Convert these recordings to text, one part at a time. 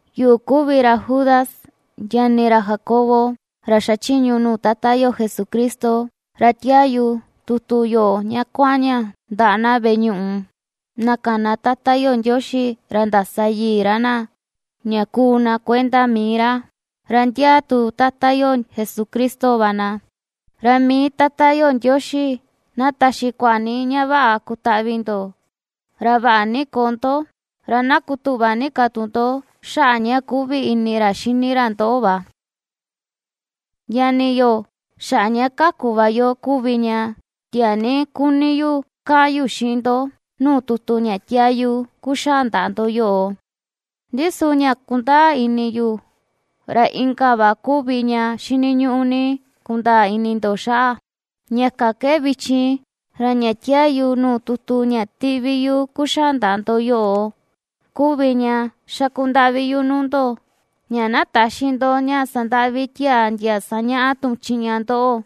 Yuꞌu kuvi ra Judas, ñani ra Jacobo, ra xachiñu yu nuu Tata yo Jesucristo, ra tiaa yu tutu yoꞌo ña kuaꞌan ña ndaꞌa na veꞌe ñuꞌu, na kana Tata yo Ndioxi, ra ndasa yii ra na ña kuu na kuenda mii ra, ra ndiaa tu Tata yo Jesucristo va na. Ra mii Tata yo Ndioxi na taxi kuaꞌa ni ña vaꞌa kutaꞌvi ndo, ra vaꞌa ni koo ndo, ra na kutuꞌva ni ka tu ndo xaꞌa ña kuꞌvi ini ra xini ra ndoꞌo va. Ñani yo, xaꞌa ña kaku va yo kuvi ña tiaa ni kuni ni yu kaꞌan yu xiꞌin ndo nuu tutu ña ^tiaa yu kuxaa ndaꞌa ndo yoꞌo; ndi su ña kundaa ini yu, ra inka va kuvi ña xiniñuꞌu ni kundaa ini ndo xaꞌa, ña kan ke vichin, ra ña tiaa yu nuu tutu ña ^tiꞌvi yu kuxaa ndaꞌa ndo yoꞌo kuvi ña xaku ndaꞌvi yu nuu ndo, ña na täxi ndo ña sandaꞌvi tiaa ndia sañaꞌa tuꞌun chiꞌña ndoꞌo,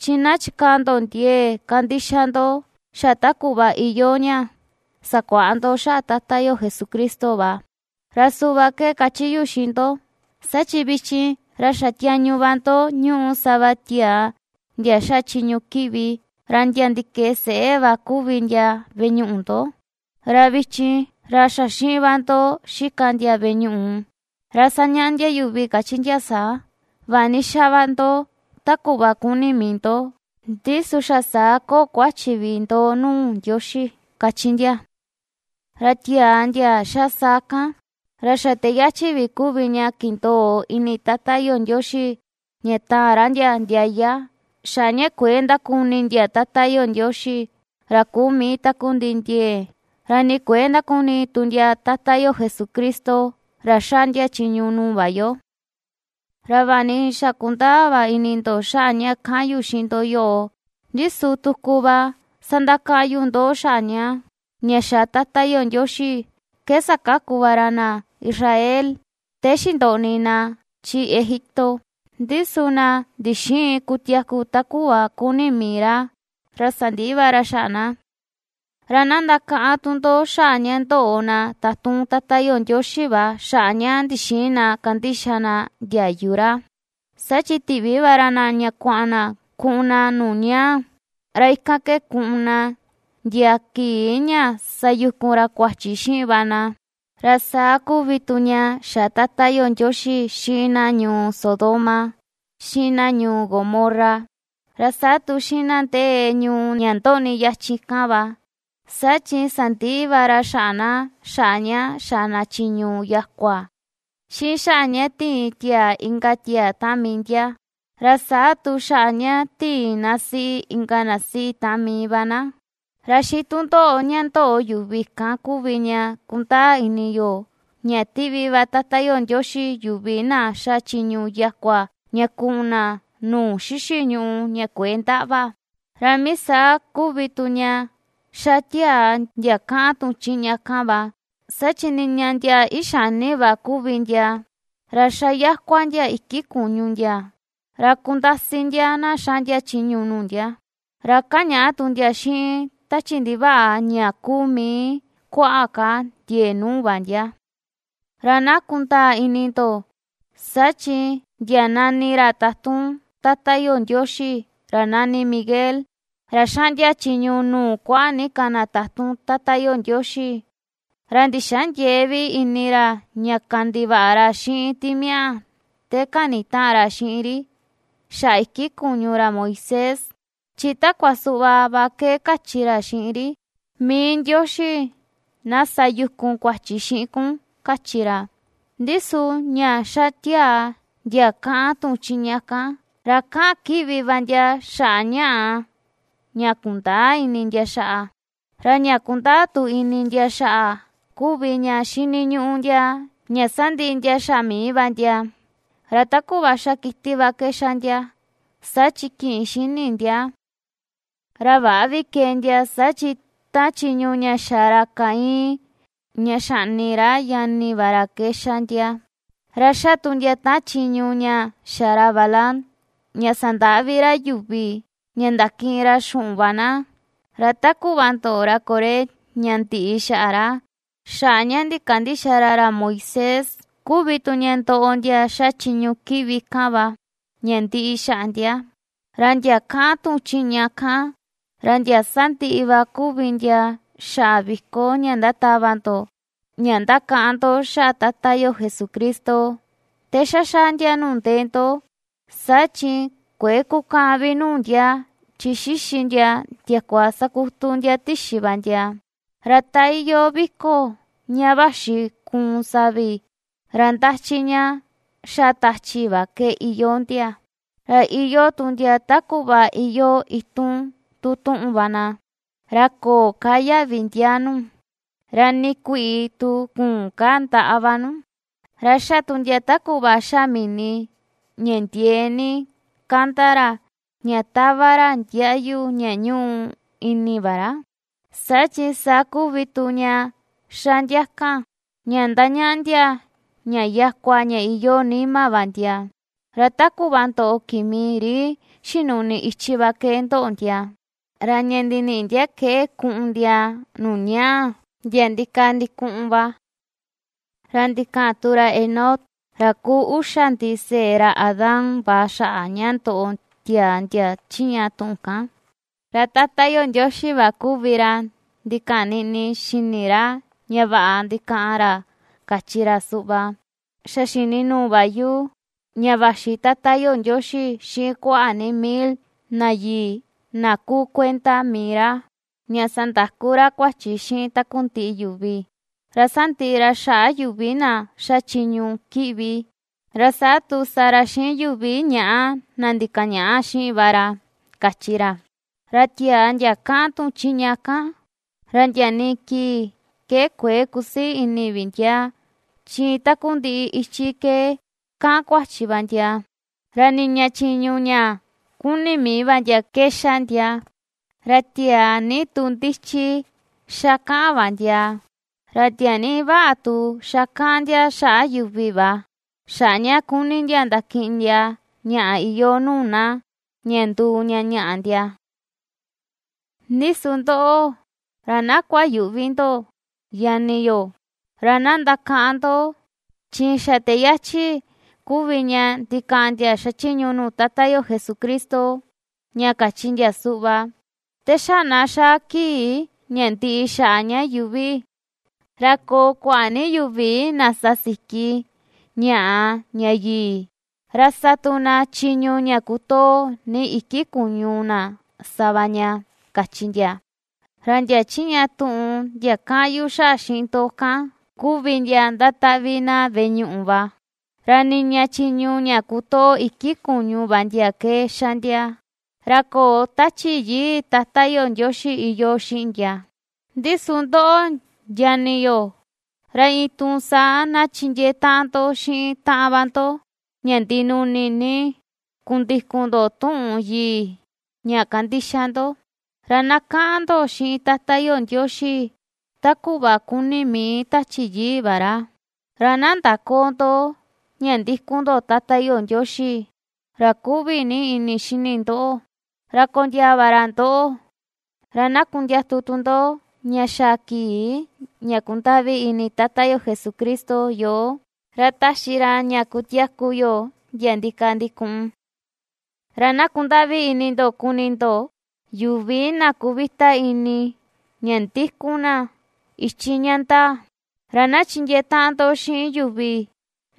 chi na chikaa ndo ndiee kandixa ndo xa ta kuꞌva iyoo ña sakuaꞌa ndo xaꞌa Tata yo Jesucristo va. Ra suꞌva ke kachi yu xiꞌin ndo, saa chi vichin, ra xa tiañu va ndo ñúꞌu sava tiaa ndia xa chiñu kiꞌvi, ra ndia ndikee seꞌé va kuvi ndia veꞌe ñuꞌu ndo, ra vichin, ra xa xiꞌin va ndo xika ndia veꞌe ñuꞌu; ra sañaꞌa ndia yuvi kachi ndia saa: “Vaꞌa ni xa va ndo ta kuꞌva kuni mii ndo, ndi su xa saa köo kuachi vi ndo nuu Ndioxi”, kachi ndia. Ra tiaa ndia ^xa saa kan, ra xa te yachi vi kuvi ña kindoo ini Tata yo Ndioxi ña taan ra ndia ndiaya, xaꞌa ña kuëe ndakuni ndia Tata yo Ndioxi, ra kuu mii takundiꞌi ndiee, ra ni kuëe ndakuni tu ndia Tata yo Jesucristo, ra xaꞌndia chiñu nuu va yo. Ra vaꞌa ni xa kundaa va ini ndo xaꞌa ña ^kaꞌan yu xiꞌin ndo yoꞌo, ndi su tuku va sandakaꞌan yu ndoꞌo xaꞌa ña, ña xa Tata yo Ndioxi ke sakaku va ra na Israel te xindoꞌni na chi Egipto, ndi su na ndixïin kutiaku ta kuꞌva kuni mii ra, ra sandiꞌi va ra xaꞌa na. Ra na ndakaꞌan tu ndo, xaꞌa ña ndoꞌo na tatun Tata yo Ndioxi va xaꞌa ña ndixïin na kandixa na ndiayu ra, saa chi tiꞌvi va ra na ña kuaꞌan na kuꞌun na nuu ñaa, ra ikan ke kuꞌun na ndia kii ña sayukun ra kuachi xiꞌin va na. Ra saa kuvi tu ña xa Tata yo Ndioxi xiꞌin na ñuu Sodoma, xiꞌin na ñuu Gomorra, ra saa tu xiꞌin na ndee ñuu ña ndoꞌni yachin kan va: saa chi sandiꞌi va ra xaꞌa na, xaꞌa ña ^xa na chiñu yakua, xiꞌin xaꞌa ña tiin tiaa inka tiaa taꞌan mii ndia, ra saa tu xaꞌa ña tiin na siꞌi, inka na siꞌi taꞌan mii va na. Ra xiꞌin tundoꞌo ña ndoꞌo yuvi kan kuvi ña kundaa ini yo ña ^tiꞌvi va Tata yo Ndioxi yuvi na xa chiñu yakua ña kuꞌun na nuu xixi ñùꞌù ña kuëe ndaꞌva. Ra mii saa kuvi tu ña ^xa tiaa ndia kaꞌan tuꞌun chiꞌña kan va, saa chi niña ndia ixani va kuvi ndia, ra xa yakua ndia iki kuñu ndia, ra kundasi ndia na xaꞌndia chiñu nuu ndia, ra kañaꞌa tu ndia xiꞌin tachi ndivaꞌa ña kuu mii kuaꞌa ka ndiee nuu va ndia. Ra na kundaa ini ndo, saa chi ndia nani ra tatun Tata yo Ndioxi, ra nani Miguel, ra ^xaꞌndia chiñu nuu kuaꞌa ni ka na tatun Tata yo Ndioxi, ra ndixäa ndiee vi ini ra ña kandivaꞌa ra xiꞌin timiaꞌa te kanitaꞌan ra xiꞌin ri xaꞌa iki kuñu ra Moisés, chi takua suꞌva va ke kachi ra xiꞌin ri: “Mii Ndioxi na sa yukun kuachi xiꞌin kun”, kachi ra. Ndi su ña ^xa tiaa ndia kaꞌan tuꞌun chiꞌña kan, ra kaꞌan kiꞌvi va ndia, xaꞌa ñaꞌa ña kundäa ini ndia xaꞌa. Ra ña kundaa tu ini ndia xaꞌa kuvi ña xiniñuꞌu ndia ña sandiꞌi ndia xaꞌa mii va ndia, ra ta kuꞌva ^xa kiti va ke xa ndia, saa chi kïꞌin xini ndia. Ra väꞌa vi kee ndia, saa chi taꞌan chiñu ña xa ra Caín ña xaꞌni ra ñani va ra ke ^xa ndia; ra ^xa tu ndia taꞌan chiñu ña xa ra Balaam ña sandaꞌvi ra yuvi ña ndakiꞌin ra xuꞌun va na; ra ta kuꞌva ndoꞌo ra Coré ña ndiꞌi xaꞌa ra, xaꞌa ña ndikandïxa ra ra Moisés kuvi tu ña ndoꞌo ndia ^xa chiñu kiꞌvi kan va ña ndiꞌi xaꞌa ndia. Ra ndia kaꞌan tuꞌun chiꞌña kan, ra ndia sandiꞌi va kuvi ndia xaꞌa viko ña ndatava ndo ña ndakaꞌan ndo xaꞌa Tata yo Jesucristo te xa xaa ndia nuu ndee ndo, saa chi kuëe kukaꞌan vi nuu ndia, chi xixi ndia ndiakua sakutu ndia tixi va ndia. Ra ta iyoo vi̱ko̱ ña vaxi kuun savi, ra ndachi ña xa tachi va ke iyoo ndia, ra iyoo tu ndia ta kuꞌva iyoo itun tun tuꞌun va na, ra köo ka yaꞌvi ndiaa nu, ra nii kuiꞌi tu küun ka ndaꞌa va nu. Ra ^xa tu ndia ta kuꞌva ^xa mini ña ndiee ni kanda ra ña tava ra ndiaꞌyu ña ñuꞌu ini va ra, saa chi saa kuvi tu ña ^xa ndia kan ña ndañaꞌa ndia ña yakua ña iyoo nima va ndia; ra ta kuꞌva ndoꞌo kimi ri xinuꞌni ichi va ke ndoꞌo ndia, ra ña ndiniꞌi ndia ke kuꞌun ndia nuu ñaa ndia ndikaa ndikuꞌun va. Ra ndikaꞌan tu ra Enoc, ra kuu uxa ndiseꞌe ra Adán va xaꞌa ña ndoꞌo tiaa ndia chiꞌña tuꞌun kan, ra Tata yo Ndioxi va kuvi ra ndikaꞌan niꞌni xini ra ña vaꞌa ndikaꞌan ra kachi ra suꞌva: “Xa xini nuu va yu ña vaxi Tata yo Ndioxi xiꞌin kuaꞌa ni mil na yii na kuu kuenda mii ra, ña sandakú ra kuachi xiꞌin takundiꞌi yuvi, ra sandiꞌi ra xaꞌa yuvi na ^xa chiñu kiꞌvi, ra saa tu sa ra xiꞌin yuvi ñaꞌa na ndikaꞌan ñaꞌa xiꞌin va ra”, kachi ra. Ra tiaa ndia ^kaꞌan tuꞌun chiꞌña kan, ra ndia nii kii ke kuëe ^kusii ini vi ndia, chi iin takundiꞌi ichi ke ^kaꞌan kuachi va ndia, ra niña chiñu ña ^kuni mii va ndia ke ^xa ndia, ra tiaa ni tu ndichi ^xa kaꞌan va ndia, ra tiaa ni vaꞌa tu ^xa kaꞌan ndia xaꞌa yuvi va, xaꞌa ña kuni ndia ndakiꞌin ndia ñaꞌa iyoo nuu na ña nduu ña ñaꞌa ndia. Ndi su ndoꞌo, ra na kuayüꞌvi ndo ñani yo, ra na ndakaꞌan ndo, chi xa te yachi kuvi ña ndikaꞌan ndia xachiñu nuu Tata yo Jesucristo, ña kachi ndia suꞌva: “Te xa na xaa kii ña ndiꞌi xaꞌa ña yuuvi, ra koo kuaꞌa ni yuvi na sa siki ñaꞌa ña yii, ra sa tu na chiñu ña kutoo ni iki kuña na sa va ña”, kachi ndia. Ra ndia chiꞌña tuꞌun ndia kaꞌan yu xaꞌa xiꞌin ndo kan, kuvi ndia ndataꞌvi na veꞌe ñuꞌu va; ra niña chiñu ña kutoo iki kuñu va ndia ke xa ndia, ra köo Tachi Yii Tata yo Ndioxi iyoo xiꞌin ndia. Ndi su ndoꞌo ñani yo, ra iin ^tuun saa na chindiee taꞌan ndo xiꞌin taꞌan va ndo ña ndinuni ni kundikun ndo tuꞌun yii ña ^kandixa ndo, ra na kaꞌan ndo xiꞌin Tata yo Ndioxi ta kuꞌva kuni mii Tachi Yii va ra. Ra na ndaköo ndo ña ndikun ndo Tata yo Ndioxi, ra kuꞌvi ni ini xini ndoꞌo, ra kondiaa va ra ndoꞌo; ra na kundiatu tu ndo ña xaa kii ña kundaꞌvi ini Tata yo Jesucristo yoo, ra taxi ra ña kutiaku yo ndia ndikaa ndikuꞌun. Ra na kundaꞌvi ini ndo kuni ndo, yuvi na kuvita ini ña ndikun na ichi ña ndaa. Ra na chindiee taꞌan ndo xiꞌin yuvi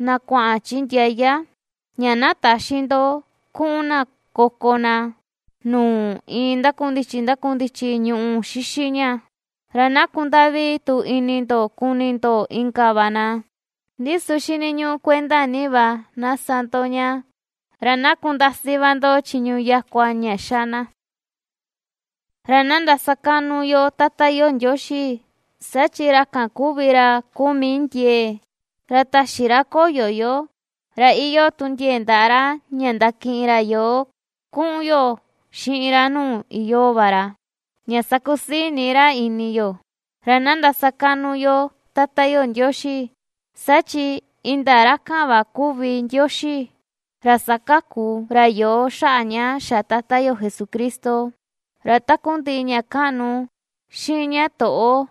na kuaꞌan chi ndiaya ña täxi ndo kuꞌun na koko na nuu iin ndakundichi ndakundichi ñuꞌu xixi ña; ra na kundaꞌvi tu ini ndo kuni ndo inka va na, ndi su xiniñuꞌu kuenda ni va na sa ndo ña, ra na kundasi va ndo chiñu yakua ña ^xa na. Ra na ndasakaꞌnu yo Tata yo Ndioxi, saa chi ra kan kuvi ra kuu mii ndiee, ra täxi ra koyo yo, ra iyoo tu ndiee ndaꞌa ra ña ndakiꞌin ra yoo kuꞌun yo xiꞌin ra nuu iyoo va ra, ña sakusii ni ra ini yo. Ra na ndasakaꞌnu yo Tata yo Ndioxi, saa chi indaa ra kan va kuvi Ndioxi, ra ^sakaku ra yoo xaꞌa ña xa Tata yo Jesucristo. Ra takundiꞌi ña kaꞌnu, xiꞌin ña toꞌo,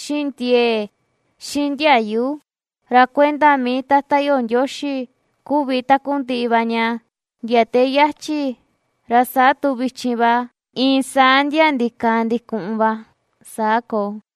xiꞌin ndiee, xiꞌin ndiayu, ra kuenda mii Tata yo Ndioxi kuvi takundiꞌi va ña ndia te yachi, ra saa tu vichin va, iin saa ndia ndikaa ndikuꞌun va. Saa koo.